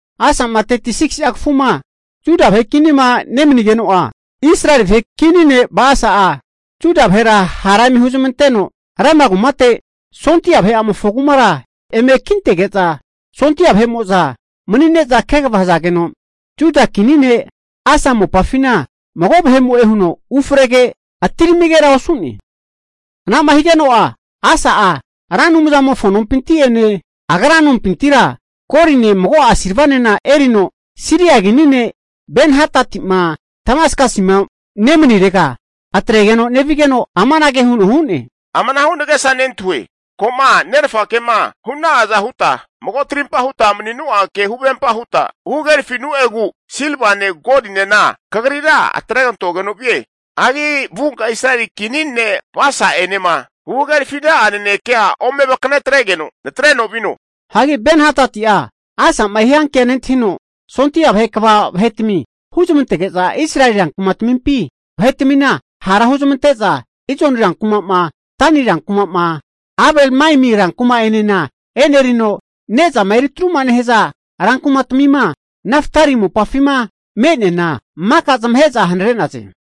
Asa'ma 36si'a kafuma Juda vahe kinima nemanigeno'a, Israeli vahe kini ne' Basa'a Juda vahera hara eme huzmanteno, Rama kumate sondia vahe'amofo kumara eme kintege'za sondia vahe'mo'za mani'ne'za kegava hazageno, Juda kini ne' Asa mopafina mago vahe'mo'e huno ufrege, atiramigera osu'ne. Ana'ma higeno'a Asa'a Ra Anumzamofo nompinti'ene agra nompintira goline mago'a silvanena erino Siria kini ne' Ben-Hadati'ma Damaskasima nemanirega atregeno nevigeno, amanage huno hu'ne, Amanahu nagesa nentahue, ko'ma nerfakema hu'na'aza huta mago trimpa huta maninu'a ke huvempa huta huhagerafinu'egu silvane golinena kagritega atregantogeno vie. Hagi vunka Israeli kini ne' Basa'enema huhagerafina'a nanekea ome vakanetregeno natreno vino. Hagi Ben-Hadati'a Asa'ma hiankea nentahino, sondia vahe kva vahetami huzmantege'za Israeli rankumatmimpi vahetmina hara huzmante'za Ijoni rankuma'ma, Dani rankuma'ma, Abel-Maimi rankuma'enena e'nerino, ne'zama eritruma nehaza rankumatmima Naftali mopafima me'neana maka zamahe'za hanare'naze.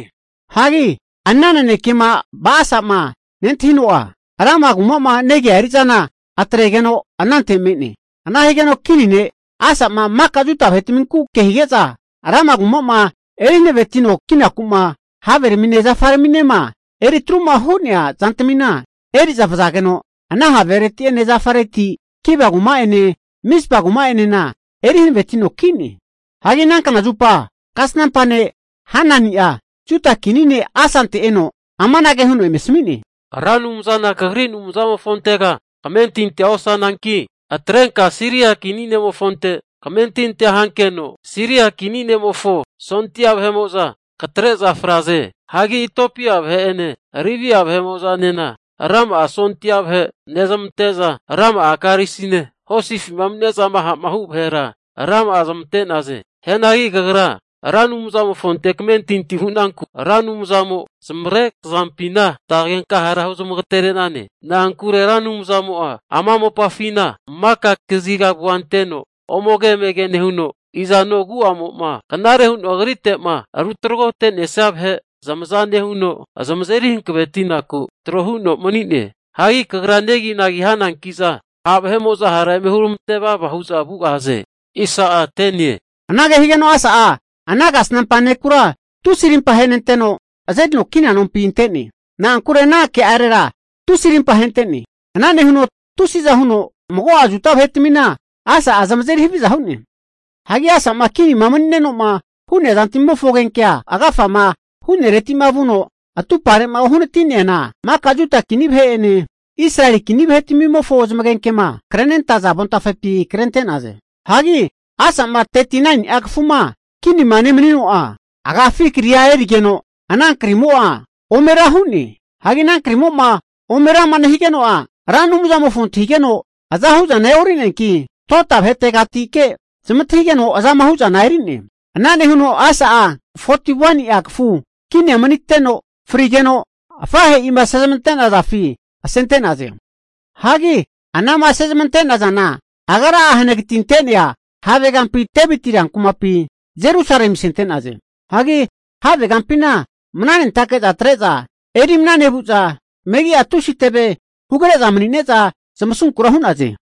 Hagi ana nanekema Ba'asa'ma nentahino'a, Rama kuma'ma negia eri'zana atregeno anante me'ne. Ana higeno kini ne' Asa'a maka Juda vahetaminku ke hige'za, Rama kuma'ma eri hanavetino kinaku'ma haveramine zafaraminema eri atruma hu'nea zantamina, eri'za vazageno ana havereti'ene zafareti Geba kuma'ene Mizpa kuma'enena eri hanavetino ki'ne. Hagi ana kna zupa kasnampa ne' Hanani'a Juda kini ne' Asante eno amanage huno eme asmi'ne, Ra Anumzana kagri Anumzamofontera kamentintia osananki, atrenka Siria kini ne'mofonte kamentintia hankeno, Siria kini ne'mofo sondia vahe'mo'za katre'za fraze. Hagi Itiopia vahe'ene Libia vahemo'zanena rama'a sondia vahe nezmante'za rama'a karisine hosifima mani'ne'zama ha'ma hu vahera rama'a zamante'naze. Hianagi kagra Ra Anumzamofonte kamentinti hu'nanku, Ra Anumzamo zamavare kazampina zamante'genka hara huzmagatere'nane. Na'ankure Ra Anumzamo'a ama mopafina maka kaziga avua anteno omege emege nehuno, i'zano agu'amo'a knare huno Agrite'ma rutragote'nesia vahe zamaza nehuno zamazeri hanavetinaku tro huno mani'ne. Hagi kagra neginagi'za hananki'za, ha' vahe'mo'za hara eme huramante vava hu'za vugahaze. Anage higeno Asa'a ana kasnampa nekura tusi rimpa ahenenteno, azerino kina nompi ante'ne. Na'ankure ana ke'arera tusi arimpa ahente'ne. Ana nehuno tusiza huno mago'a Juda vahetmina Asa'a zamazeri haviza hu'ne. Hagi Asa'ma kinima mani'neno'ma hu'nea zantmimofo agenkea, agafama hu'nereti'ma vuno atumpare'ma uhanati'neana maka Juda kini vahe'ene Israeli kini vahetmimofo zamagenkema krenentaza avontafepi krente'naze. Hagi Asa'ma 39ni'a kafuma kinima nemanino'a, agafi kria efore higeno ana kri'amo'a ome ra hu'ne. Hagi ana krimo'ma ome rama nehigeno'a, Ra Anumzamofona antahigeno azahu zana e'orineanki, dota vahetegatike zmantahigeno azama hu zana eri'ne. Ana nehuno Asa'a 41ni'a kafu kinia maniteno frige'za afahe'ima asezmante'nazafi asente'naze. Hagi anama asemante'nazana agra'a hanagatinte'nea havegampi Deviti rankumapi Jerusalemi asente'naze. Hagi havegampina mnanentake'za atre'za eri mana nevu'za megi'a tusi teve hugre'za mani'neza zamasunkura hu'naze.